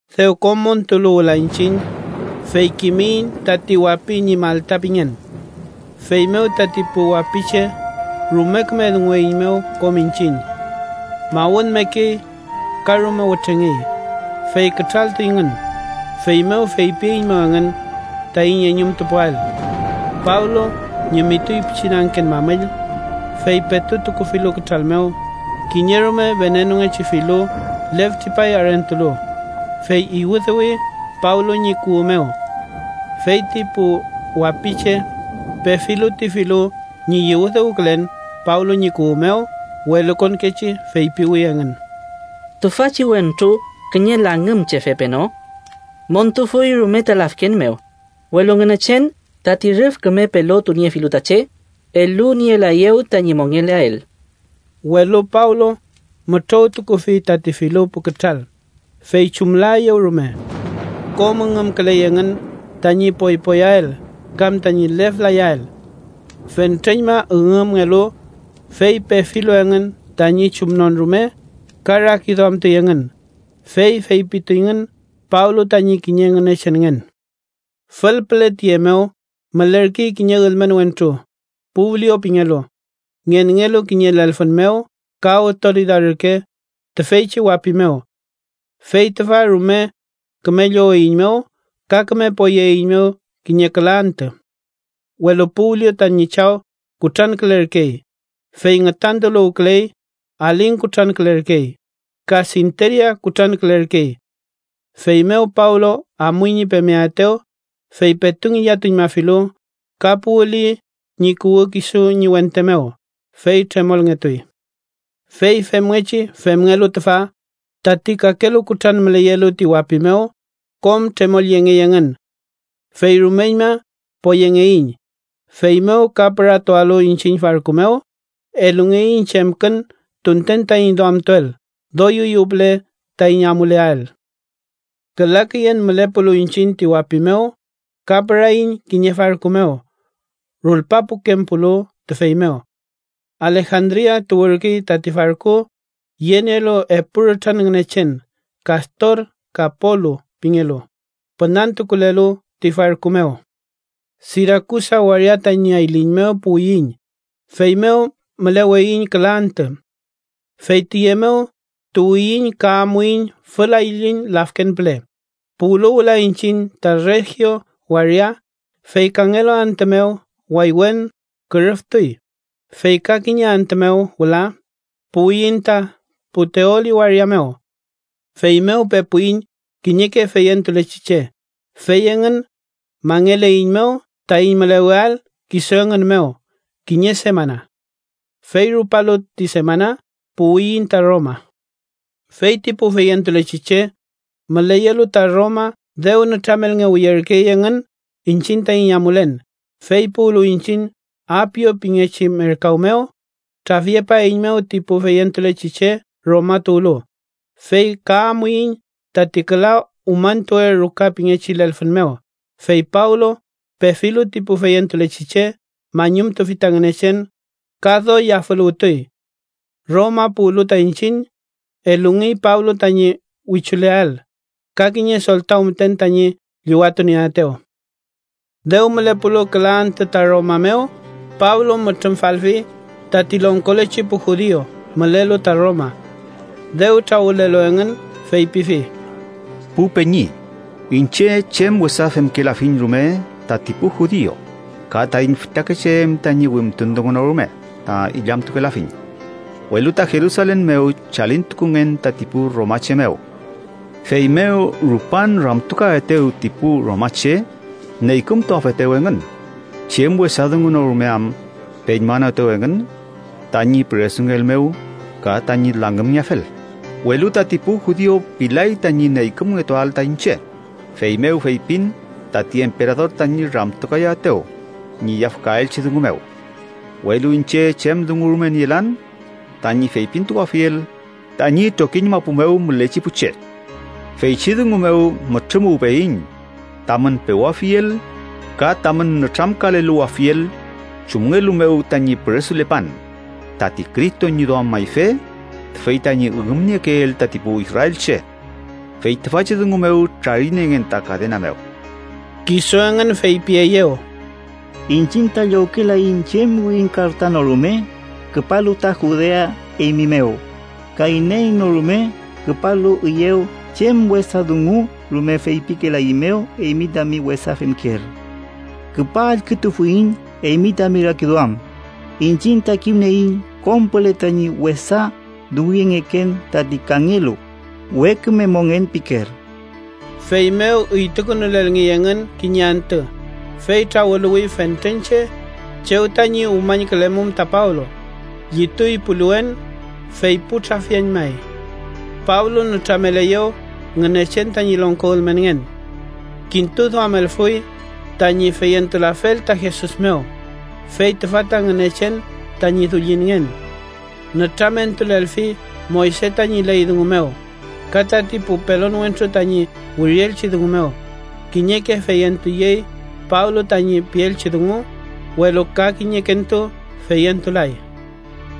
Dew kom montulu wüla iñchiñ, fey kimiyiñ tati wapi ñi Malta pingen. Feymew tati pu wapiche rume küme dungueiñmew kom iñchiñ. Mawünmekey ka rume wütrengey, fey kütraltuyngün, feymew feypieiñmew engün taiñ eñumtupuael. Pablo ñimituy pichin angken mamüll, fey petu tukufilu kütral mew, kiñe rume venenungechi filu lef tripay arentulu, fey iwüdüwi Pablo ñi kuwü mew. Fey ti pu wapiche, pefilu ti filu ñi iwüdüwkülen Pablo ñi kuwü mew, welukonkechi feypiwi engün: “¿Tüfachi wentru kiñe langümchefe peno? Montufuy rume ta lafken mew, welu Ngünechen, tati rüf küme pelotuniefilu ta che, elunielaeyew tañi mongeleael.” Welu Pablo mütrowtukufi tati filu pu kütral, fey chumlaeyew rume. Kom üngümküley engün tañi poypoyael kam tañi lef layael. Fentreñma üngümngelu, fey pefilu engün tañi chumnon rume, ka rakiduamtuy engün, fey feypituyngün Pablo tañi kiñe ngünechenngen. Fülpüle tiye mew mülerkey kiñe ülmen wentru, Publio pingelu, ngenngelu kiñe lelfün mew ka awtoridad ürke tüfeychi wapi mew. Fey tüfa rume küme lloweiñmew ka küme poyeeiñmew kiñe küla antü. Welu Publio tañi chaw kutrankülerkey, fey ngütantuluwküley. Aling kutrankülerkey ka sinteria kutrankülerkey. Feymew Pablo amuy ñi pemeaetew, fey petu ngillatuñmafilu, ka puwüli ñi kuwü kisu ñi wente mew, fey tremolngetuy. Fey femngechi femngelu tüfa, tati kakelu kutran müleyelu ti wapi mew, kom tremolyengey engün. Fey rumeñma poyengeiñ, feymew ka püratualu iñchiñ farku mew, elungeiñ chemkün tunten taiñ duamtuael doy üyew püle taiñ amuleael. Küla küyen mülepulu iñchiñ ti wapi mew, ka püraiñ kiñe farku mew rulpapukempulu tüfey mew. Alejandria tuwürkey tati farku, yenielu epu rütran ngünechen Kastor ka Polu pingelu, pünantukulelu ti farku mew. Sirakusa waria tañi ayliñ mew puwiyiñ, feymew müleweiñ küla antü. Fey tiye mew tuwiyiñ ka amuiñ fül ayliñ lafken püle. Puwlu wüla iñchiñ ta Regio waria, fey kangelu antü mew waywen kürüftuy, fey ka kiñe antü mew wüla puwiyiñ ta Puteoli waria mew. Feymew pepuiñ kiñeke feyentulechi che, fey engün mangeleiñmew taiñ müleweael kisu engün mew kiñe semana. Fey rupalu ti semana, puwiyiñ ta Roma. Feyti pu feyentulechi che müleyelu ta Roma dew nütramelngewiyerkey engün iñchiñ taiñ amulen, fey puwlu iñchiñ Apio pingechi merkaw mew, trafyepaeiñmew ti pu feyentulechi che Roma tuwlu, fey ka amuiñ tati Küla Umañtuwe Ruka pingechi lelfün mew. Fey Pablo pefilu ti pu feyentulechi che, mañumtufi ta Ngünechen ka doy yafüluwtuy. Roma puwlu ta iñchiñ, elungey Pablo tañi wichuleael, ka kiñe soltaw müten tañi llüwatunieaetew. Dew mülepulu küla antü ta Roma mew, Pablo mütrümfalfi tati longkolechi pu judiu mülelu ta Roma. Dew trawülelu engün, feypifi: —Pu peñi, iñche chem wesa femkelafiñ rume tati pu judiu ka taiñ fütakeche em tañi wimtun dungu no rume ta illamtukelafiñ. Welu ta Jerusalen mew chalintukungen tati pu romache mew. Feymew rupan ramtukaetew ti pu romache neykümtuafetew engün, chem wesa dungu no rume am peñmanoetew engün tañi püresungeel mew ka tañi langümngeafel. Welu tati pu judiu pilay tañi neykümngetuael ta iñche, feymew feypin tati emperador tañi ramtukayaetew ñi yafkaelchi dungu mew, welu iñche chem dungu rume nielan tañi feypintukuafiel tañi trokiñ mapu mew mülechi pu che. Feychi dungu mew mütrümuwpeyiñ, tamün pewafiel, ka tamün nütramkaleluwafiel chumngelu mew tañi püresulepan tati Cristo ñi duam mayfe tüfey tañi üngümniekeel tati pu israelche. Fey tüfachi dungu mew trariniengen ta kadena mew. Kisu engün feypieyew: —Iñchiñ ta llowkelaiñ chem wirin karta no rume küpalu ta Judea eymi mew, ka iney no rume küpalu üyew chem wesa dungu rume feypikelaeiñmew eymi tami wesa femkeel. Küpa allkütufuiñ eymi tami rakiduam, iñchiñ ta kimnieiñ kom püle tañi wesa dunguyengeken tati kangelu we küme mongen pikeel. Feymew üytukünulelngey engün kiñe antü, fey trawüluwi fentren che chew tañi umañkülemum ta Pablo. Llituy puliwen fey pu trafiañmay. Pablo nütrameleyew Ngünechen tañi longko ülmenngen. Kintuduamelfuy tañi feyentulafel ta Jesus mew, fey tüfa ta Ngünechen tañi Dullinngen. Nütramentulelfi Moyse tañi ley dungu mew ka tati pu pelon wentru tañi wirielchi dungu mew. Kiñeke feyentuyey Pablo tañi pielchi dungu, welu ka kiñekentu feyentulay.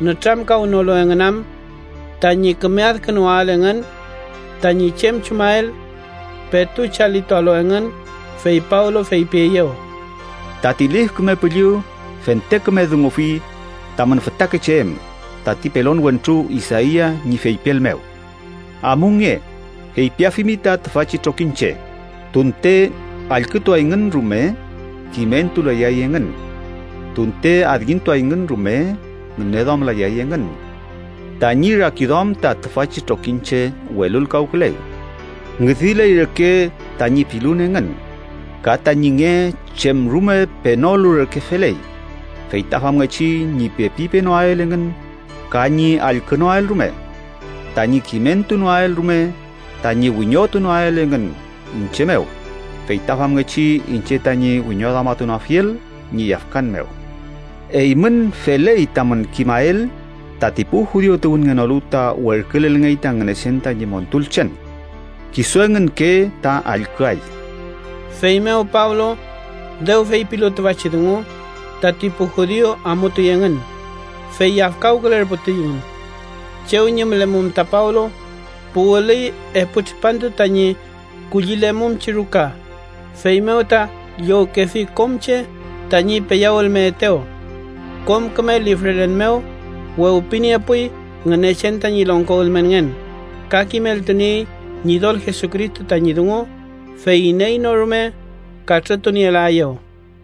Nütramkawnolu engün am tañi küme adkünuwael engün tañi chem chumael, petu chalitualu engün, fey Pablo feypieyew: —Tati Lif Küme Püllü fente küme dungufi tamün fütakeche em tati pelon wentru Isaia ñi feypiel mew: ‘Amunge, feypiafimi ta tüfachi trokiñche: Tunte allkütuayngün rume, kimentulayay engün. Tunte adkintuayngün rume, ngüneduamlayay engün. Tañi rakiduam ta tüfachi trokiñche welulkawküley. Ngüdiley reke tañi pilun engün ka tañi nge chem rume penolu reke feley, fey ta famngechi ñi pepi penoael engün ka ñi allkünoael rume, tañi kimentunoael rume, tañi wiñotunoael engün iñche mew, fey ta famngechi iñche tañi wiñoduamatunoafiel ñi yafkan mew.’ Eymün feley tamün kimael tati pu judiu tuwünngenolu ta werkülelngey ta Ngünechen tañi montulchen. Kisu engünke ta allküay. Feymew Pablo dew feypilu tüfachi dungu, tati pu judiu amutuy engün, fey yafkawkülerputuyngün. Chew ñi mülemum ta Pablo puwülüy epu tripantu tañi kullilemumchi ruka, feymew ta llowkefi kom che tañi peyawülmeetew. Kom küme lifrelen mew wewpiniepuy Ngünechen tañi longko ülmenngen, ka kimeltuniey Ñidol Jesucristo tañi dungu, fey iney no rume katrütunielaeyew.